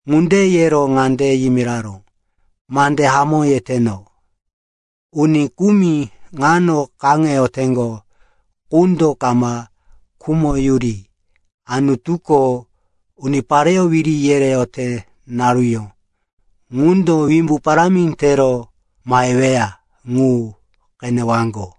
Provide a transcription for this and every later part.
Ŋunde yero ŋande yimiraró, “Mande hamó yeteno. Uni kumi ŋano kaŋeteŋgo qundo kama khumoyuri Anutuko unipareyó wiri yereyote naruyó ŋundo wimbu parámi tero maheweya ŋu qenewaŋgo.”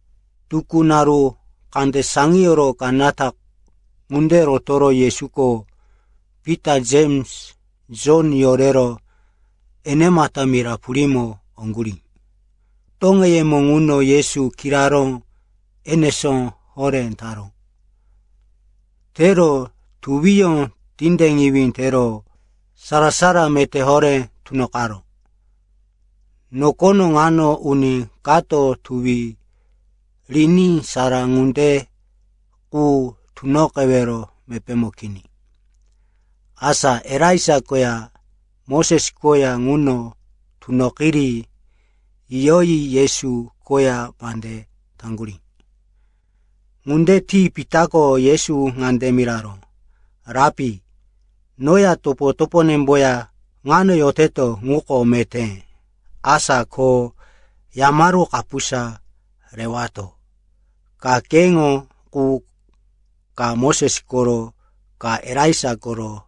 Tukú, naru kande saŋiyoro kanata ŋunde rotoro Yesuko Pita, Jems, Jon yorero enemata mira purímo oŋgurí. Toŋeyemo ŋuno Yesu kiraró enesó horé taró. Tero tuwiyó tindeŋiwí tero sara-sara meté horé tunoqaró. Nokono ŋano uni kato tuwi riní sara ŋunde qu tunoqewero mepémo kini. Asa Elaija koya Moses koya ŋuno tunoqiri yiyoyi Yesu koya mande taŋgurí. Ŋunde ti Pitako Yesu ŋande miraró, “Rapi, noya topo-toponemboya ŋano yoteto, ŋuko meté. Asa ko yamaru kapusa rewato: ka keŋo qu, ka Moses koro, ka Elaija koro.”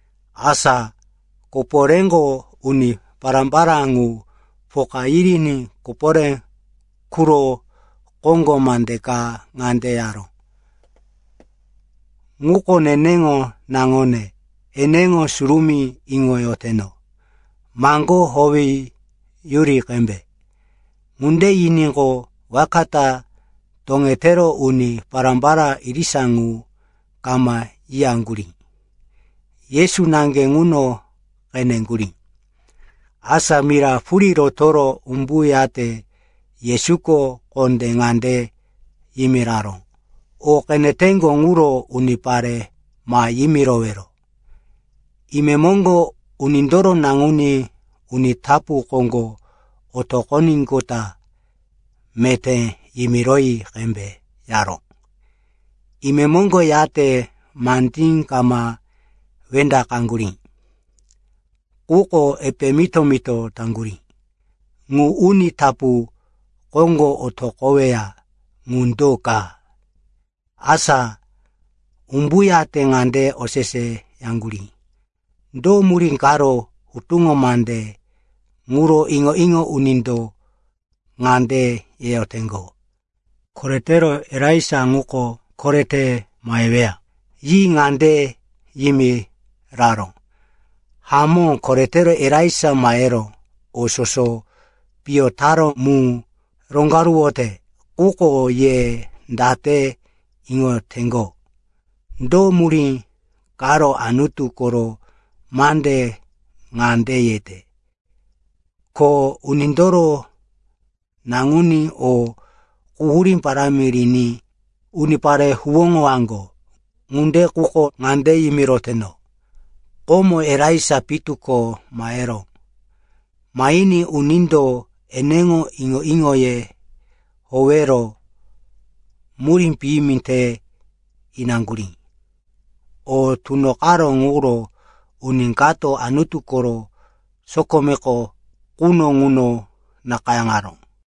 Asa koporéko uni pará-pará ŋu poka yiriní koporé quro koŋgo mande ka ŋande yaró, “Ŋuko neneŋo naŋone, eneŋo surumí iŋoyoteno. Maŋgó howeyuri qembe.” Ŋunde yiníqo, waka ta toŋetero uni pará-pará irisa ŋu kama yiyaŋgurí. Yesu naŋge ŋuno qeneŋgurí. Asa mira purí rotoro umbuyate Yesuko kondé ŋande yimiraró, “O qeneteŋgo ŋuro unipare ma yimirowero. Imemoŋgo Unindoro Naŋuní uni tapu koŋgo otoqoníqota meté yimiroyi qembe,” yaró. Imemoŋgo yate mandí kama wendaqaŋgurí. Quko epe mito-mito taŋgurí, “Ŋu ‘uni tapu koŋgo otoqoweya,’ ŋu do ka?” Asa umbuyate ŋande oseseyaŋgurí, “Do murí karo hutuŋo mande ŋuro iŋo-iŋo unindo ŋande yeyoteŋgo, ‘Koretero, Elaija ŋuko korete maheweya?’” Yi ŋande yimiraró, “Hamó, koretero Elaija mahero o soso piyo taró mu roŋgaruwote. Quko ye date iŋoteŋgo, do murí karo Anutu koro mande ŋande yete, ko Unindoro Naŋuní o quhurí parámi riní unipare huwóŋowaŋgo? Ŋunde quko ŋande yimiroteno, komo Elaija pitu ko maheró. Mahiní unindo eneŋo iŋo-iŋoye howero murí piyimi te inaŋgurí. O tunoqaró ŋuro uni kato Anutu koro sokome quno ŋuno nakayáŋaró.”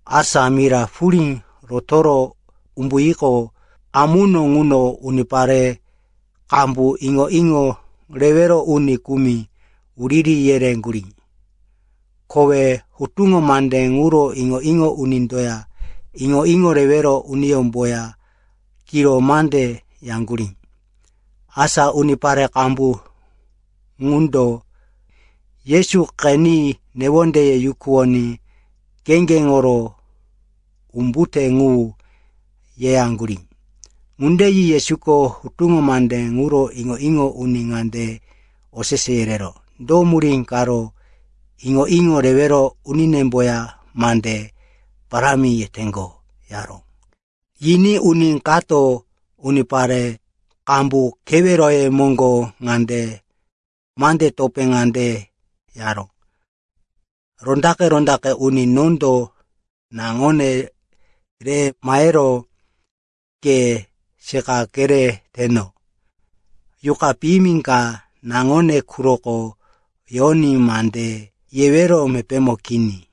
Asa mira purí rotoro umbuyiqo, amuno ŋuno unipare qambu iŋo-iŋo rewero uni kumi wuriri yereŋgurí. Kowe hutuŋo mande ŋuro iŋo-iŋo unindoya iŋo-iŋo rewero uniyómboya kiro mande yaŋgurí. Asa unipare qambu ŋundo Yesu qeni newondeye yukuwoní kheŋgeŋoro, “Umbute ŋu,” yeyaŋgurí. Ŋunde yi Yesuko hutuŋo mande ŋuro iŋo-iŋo uni ŋande osese yereró, “Do murí karo iŋo-iŋo rewero uninemboya mande parámi yeteŋgo?” yaró. Yiní uni kato unipare qambu keweroye moŋgo mande topé ŋande yaró, “Rondaqe-rondaqe uni, nondo naŋone re mahero ke seqa kereteno. Yuqa piyimi ka naŋone quroko yoní mande yewero mepémo kini.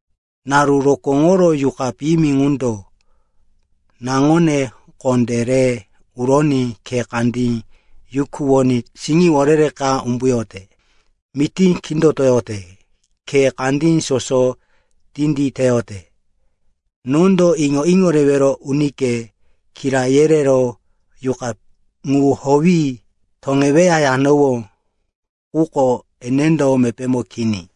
Naru rokóŋoro yuqa piyimi ŋundo naŋone kondé re uroní khe kandí yukuwoní siŋiworere ka umbuyote, mití kindotoyote, khe kandí soso tinditeyote. Nondo iŋo-iŋo rewero unike kira yerero, yuqa ŋu howi toŋeweya, yanowó. Quko enendo mepémo kini.”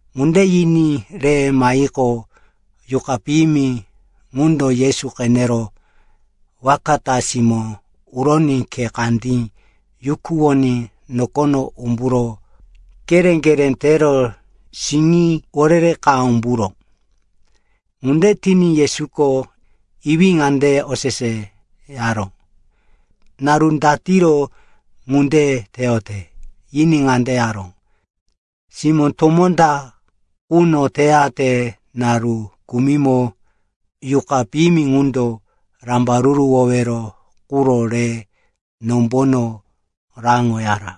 Ŋunde yiní re mahiqo, yuqa piyimi ŋundo Yesu qenero waka ta simó uroní khe kandí yukuwoní nokono umburo keré-keré tero siŋiworere ka umburó. Ŋunde tiní Yesuko iwí ŋande oseseyaró, “Naru datiro ŋunde teyote?” Yiní ŋande yaró, “Simó tomó ta quno teyate. Naru kumimo yuqa piyimi ŋundo rambaruruwowero quro re nombono raŋoyara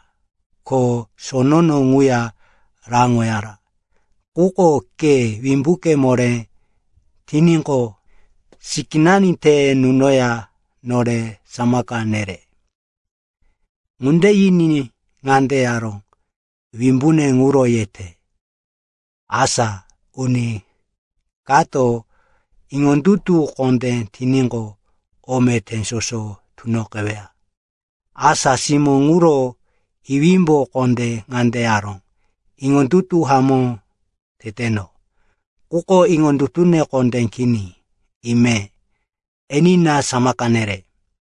ko sonono ŋuya raŋoyara. Quko ke wimbuke moré tiníqo, sikínani te nunoya nore samaka nere.” Ŋunde yiní ŋande yaró, “Wimbune ŋuro yete. Asa uni kato iŋondutu kondé tiníqo, o meté soso tunoqeweya.” Asa simó ŋuro iwímbo kondé ŋande yaró, “Iŋondutu hamó teteno! Quko iŋondutune kondé kini, ime. Enina, samaka nere.”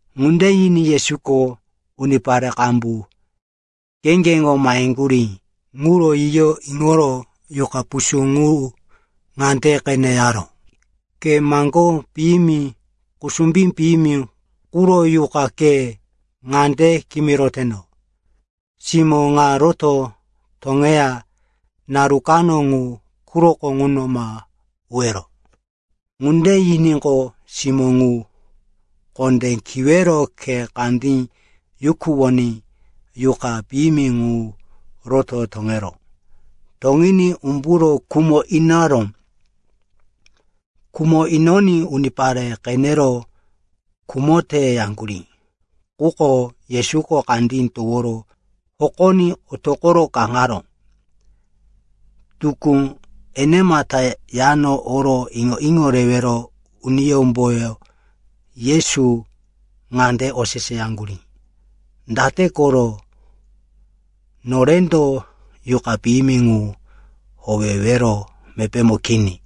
Ŋunde yiní Yesuko unipare qambu kheŋgeŋo maheŋgurí ŋuro yiyo iŋoro yuqa pusú ŋu ŋande qene yaró, “Ke maŋgó piyimi kusumbí piyimi quro yuqa, ke ŋande kimiroteno, simó ŋa roto toŋeya naru kano ŋu quroko ŋuno ma uwero.” Ŋunde yiníqo, simó ŋu kondé kiwero khe kandí yukuwoní yuqa piyimi ŋu roto toŋeró. Toŋiní umburo khumo inaró. Khumo inoní unipare qenero, “Khumote,” yaŋgurí. Quko Yesuko kandí toworo hokoní otoqo kaŋaró. Tukú enemata yano oro iŋo-iŋo rewero uniyómbo Yesu ŋande oseseyaŋgurí, “Date koro norendo yuqa piyimi ŋu howewero mepémo kini?”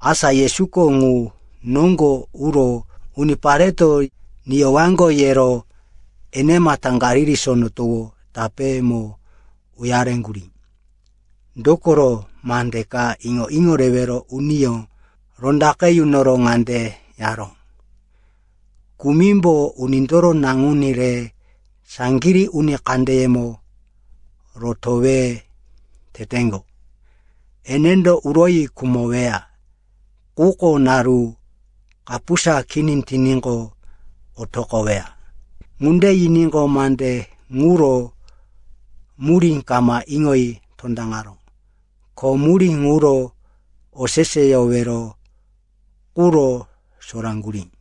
Asa Yesuko ŋu noŋgo uro unipareto niyowaŋgo yero enemata Galili Sono Towo tapémo uyareŋgurí. Dokoro mande ka iŋo-iŋo rewero uniyó rondaqe yunoro ŋande yeyaró, “Kumimbo Unindoro Naŋuní re saŋgirí uni kandeyemo rotowe teteŋgo. Enendo uroyi khumoweya, quko naru kapusa kini tiníqo, otoqoweya.” Ŋunde yiníqo, mande ŋuro murí kama iŋoyi tondaŋaró. Ko murí ŋuro oseseyowero quro soraŋgurí.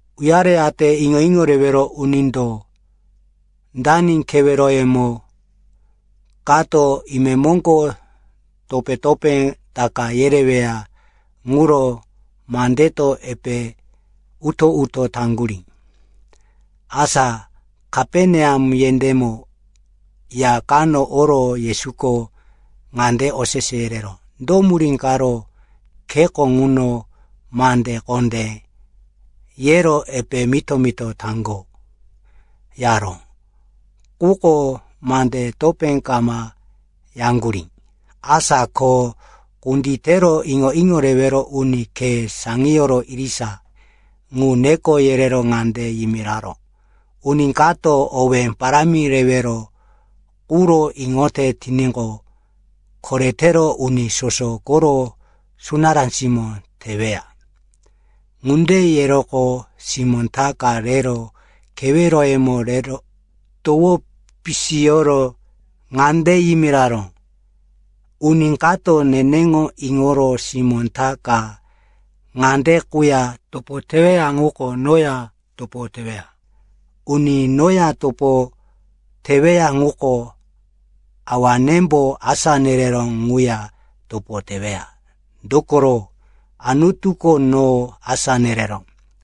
Uyareyate iŋo-iŋo rewero unindo dani keweroyemo kato imemoŋgo topé-topé taka yereweya ŋuro mandeto epe uto-uto taŋgurí. Asa Kaperneam yendémo ya kano oro Yesuko ŋande osese yereró, “Do murí karo kheko ŋuno mande kondé yero epe mito-mito taŋgo?” yaró. Quko mande topé kama yaŋgurí. Asa ko kunditero iŋo-iŋo rewero uni khe saŋiyoro irisa ŋu neko yerero ŋande yimiraró, “Uni kato owé parámi rewero quro iŋote tiníqo, koretero uni soso koro sunará simó teweya.” Ŋunde yeroqo simó ta ka rero keweroyemo rero towo pisiyoro ŋande yimiraró, “Uni kato neneŋo iŋoro simó ta ka ŋande quya topo teweya ŋuko noya topo teweya. Uni noya topo teweya ŋuko Awanembo asá nereró ŋuya topo teweya. Dokoro Anutuko no asá nereró.”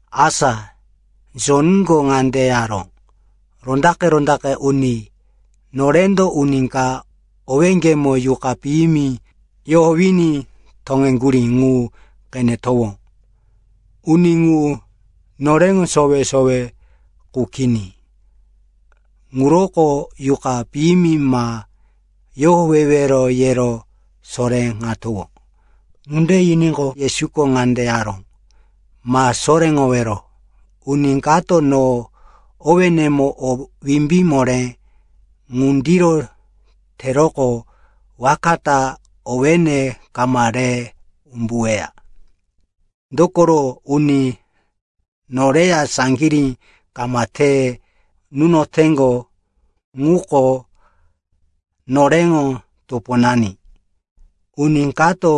Asa Jonko ŋande yaró, “Rondaqe-rondaqe uni, norendo uni ka owéŋgemo yuqa piyimi yohowiní toŋeŋgurí ŋu qenetowó. Uni ŋu noreŋo sowe-sowe qu kini. Ŋuroko yuqa piyimi ma yohowewero, yero soréŋatowó.” Ŋunde yiníqo, Yesuko ŋande yaró, “Ma soréŋowero. Uni kato no owénemo o wimbí moré ŋundiro teroqo waka ta owéne kama re umbuweya. Dokoro uni noreya saŋgirí kama te nunoteŋgo ŋuko noreŋo toponani. Uni kato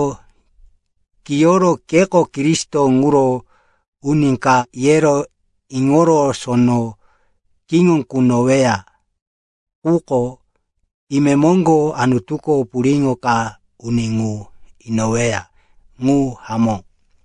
kiyoro, keko Kristo ŋuro uni ka, yero iŋoro sono kiŋo kunoweya quko, imemoŋgo Anutuko puriŋo ka uni ŋu inoweya. Ŋu hamó.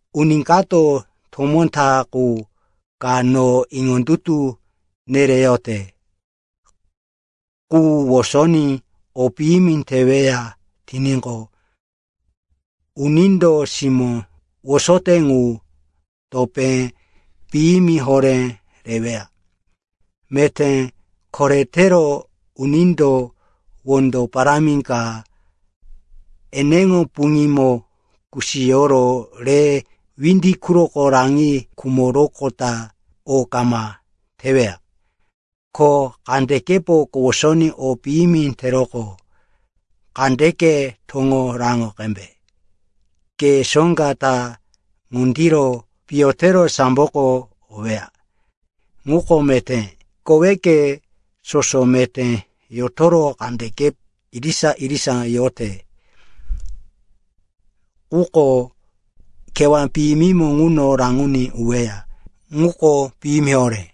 “Uni kato tomó ta qu ka no iŋondutu nereyote qu wosoní o piyimi teweya tiníqo, unindo simó wosote ŋu topé piyimi horé reweya. Meté koretero unindo wondo parámi ka eneŋo puŋímo kusiyoro re windi quroko raŋi khumoroqota o kama teweya. Ko kandekepo kowosoní o piyimi teroqo kandeke toŋo raŋo qembe. Ke soŋga ta ŋundiro piyo tero samboko oweya, ŋuko meté. Koweke soso meté yotoro kandeke irisa-irisa yote quko kewá piyimimo ŋuno raŋoní uweya, ŋuko piyimi horé.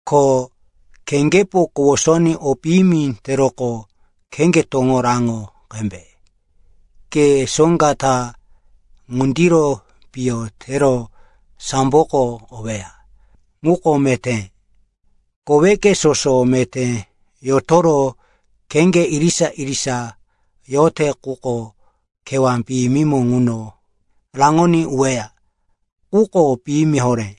Ko kheŋgepo kowosoní o piyimi teroqo kheŋge toŋo raŋo qembe. Ke soŋga ta ŋundiro piyo tero samboko oweya, ŋuko meté. Koweke soso meté yotoro kheŋge irisa-irisa yote quko kewá piyimimo ŋuno raŋoní uweya, ŋuko piyimi horé.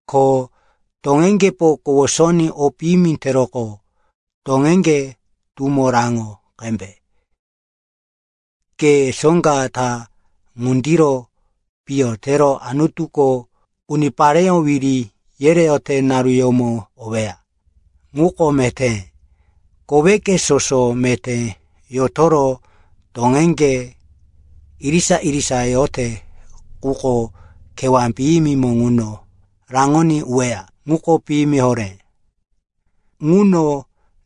Ko toŋeŋgepo kowosoní o piyimi teroqo toŋeŋge tumo raŋo qembe. Ke soŋga ta ŋundiro piyo tero Anutuko unipareyó wiri yereyote naruyómo oweya, ŋuko meté. Koweke soso meté yotoro toŋeŋge irisa-irisa yote quko kewá piyimimo ŋuno raŋoní uweya, ŋuko piyimi horé. Ŋuno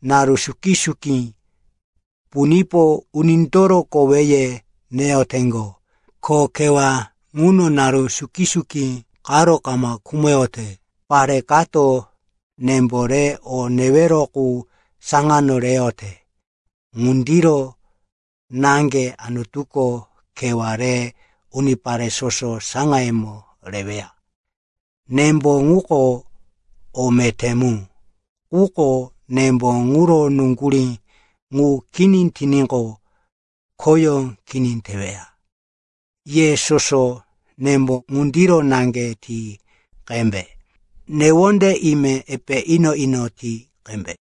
“‘naru suki-suki punipo unindoro koweye neyoteŋgo. Ko kewá ŋuno naru suki-suki qaro kama khumoyote.’ Pare kato nembo re o newero qu saŋano reyote. Ŋundiro naŋge Anutuko kewá re unipare soso saŋayemo reweya. “Nembo ŋuko o meté mu. Quko nembo ŋuro nuŋgurí ŋu kini tiníqo, khoyó kini teweya. Ye soso nembo ŋundiro naŋge ti qembe. Newonde ime epe ino-ino ti qembe.”